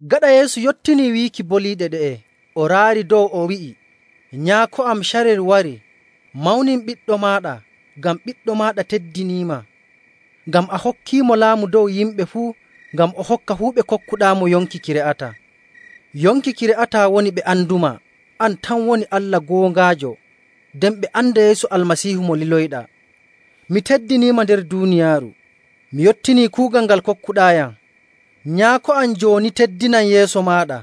Gaɗa Yeesu yottinii wiiki boliiɗe ɗe'e, o raari dow o wi'i, “Nyaako am, carel warii. Mawnin Ɓiɗɗo maaɗa, ngam Ɓiɗɗo maaɗa teddiniima. Ngam a hokkiimo laamu dow yimɓe fuu, ngam o hokka fuu ɓe kokkuɗaamo yonki ki re'ataa. Yonki ki re'ataa woni ɓe andumaa, an tan woni Allah goongaajo, nden ɓe anda Yeesu Almasiihu mo liloyɗaa. Mi teddiniima nder duuniyaaru, mi yottinii kuugal ngal kokkuɗaayam. Nyaako am, jooni teddinam yeeso maaɗa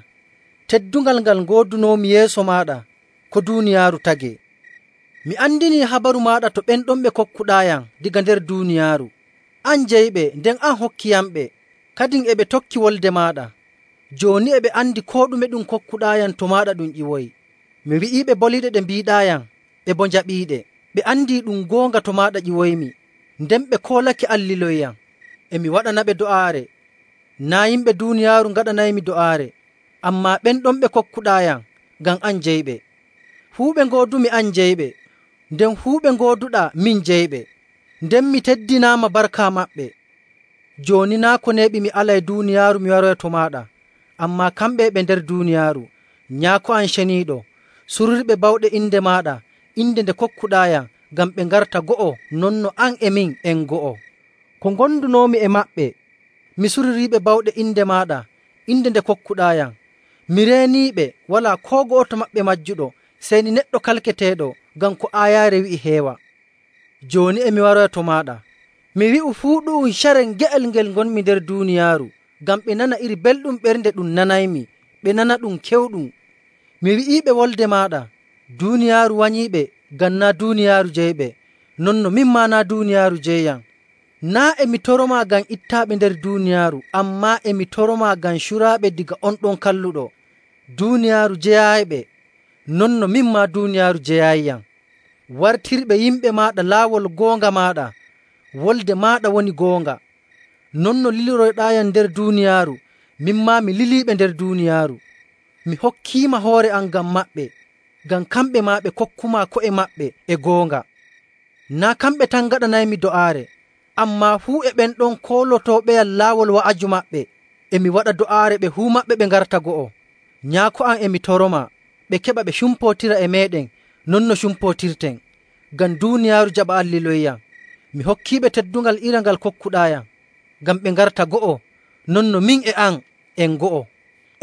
teddungal ngal ngoodunoomi yeeso maaɗa ko duuniyaaru tagee. “Mi andinii habaru maaɗa to ɓen ɗon ɓe kokkuɗaayam daga nder duuniyaaru. An jeyiɓe, nden a hokkiiyamɓe, kadin e ɓe tokki wolde maaɗa. Jooni e ɓe andi koo ɗume ɗum kokkuɗaayam to maaɗa ɗum ƴiwoyi. Mi wi'iiɓe boliiɗe ɗe mbiiɗaayam, ɓe boo njaɓiiɗe. Ɓe andii ɗum goonga to maaɗa ƴiwoymi, nden ɓe koolake an liloyiyam. “E mi waɗanaɓe do'aare. Naa' yimɓe duuniyaaru ngaɗanaymi do'aare, ammaa ɓen ɗon ɓe kokkuɗaayam, ngam an jeyiɓe. Fuu ɓe ngoodumi an jeyiɓe, nden fuu ɓe ngooduɗaa min jeyiɓe, nden mi teddinaama barka maɓɓe. Jooni naa' ko neeɓi mi alay duuniyaaru mi waroya to maaɗa, ammaa kamɓe e ɓe nder duuniyaaru. Nyaako am Ceniiɗo, surirɓe bawɗe inde maaɗa, inde nde kokkuɗaayam, ngam ɓe ngarta go'o non no an e min en go'o. Ko ngondunoomi e maɓɓe mi suririiɓe bawɗe inde maaɗa, inde nde kokkuɗaayam. Mi reeniiɓe, walaa koo go'oto maɓɓe majjuɗo, sey ni neɗɗo kalkateeɗo ngam ko aayaare wi'i heewa.. Jooni e mi waroya to maaɗa. Mi wi'u fuu ɗu'um carel nge'el ngel ngonmi nder duuniyaaru ngam ɓe nana iri belɗum ɓernde ɗum nanaymi ɓe nana ɗum kewɗum. Mi wi'iiɓe wolde maaɗa. Duuniyaaru wanyiiɓe, ngam naa' duuniyaaru jeyiɓe, non no min maa naa' duuniyaaru jeyiyam. Naa' e mi toromaa ngam ittaaɓe nder duuniyaaru, ammaa e mi toromaa ngam curaaɓe daga on ɗon Kalluɗo. Duuniyaaru jeyaayiɓe non no min maa duuniyaaru jeyaayiyam. Wartirɓe yimɓe maaɗa laawol goonga maaɗa. Wolde maaɗa woni goonga. Non no liliroyɗaayam nder duuniyaaru, min maa mi liliiɓe nder duuniyaaru. Mi hokkiima hoore am ngam maɓɓe, ngam kamɓe maa ɓe kokkumaa ko'e maɓɓe e goonga. “Naa' kamɓe tan ngaɗanaymi do'aare, ammaa fuu e ɓen ɗon koolotooɓeyam laawol wa'aju maɓɓe. E mi waɗa do'aare ɓe fuu maɓɓe ɓe ngarta go'o. Nyaako am e mi toromaa, ɓe keɓa ɓe cumpootira e meeɗen non no cumpootirten, ngam duuniyaaru jaɓa an liloyiyam. Mi hokkiiɓe teddungal iri ngal kokkuɗaayam, ngam ɓe ngarta go'o, non no min e an en go'o.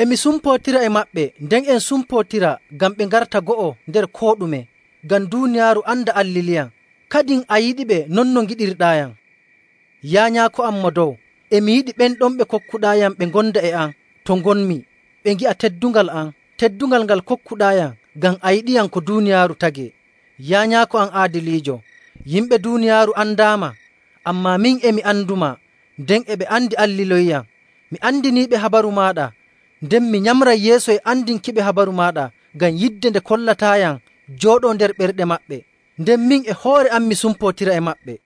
E mi sumpootira e maɓɓe nden en cumpootira ngam ɓe ngarta go'o nder koo ɗume, ngam duuniyaaru anda an liliyam, kadin a yiɗiɓe non no ngiɗirɗaayam. “Yaa Nyaako am Mo Dow, e mi yiɗi ɓen ɗon ɓe kokkuɗaayam ɓe ngonda e am to ngonmi, ɓe ngi'a teddungal am, teddungal ngal kokkuɗaayam ngam a yiɗiyam ko duuniyaaru tagee. Yaa Nyaako am aadiliijo, yimɓe duuniyaaru andaama, ammaa min e mi andumaa, nden e ɓe andi an liloyiyam. Mi andiniiɓe habaru maaɗa, nden mi nyamray yeeso e andinki habaru maaɗa, ngam yidde nde kollataayam jooɗoo nder ɓerɗe maɓɓe, nden min e hoore am mi sumpootira e maɓɓe.”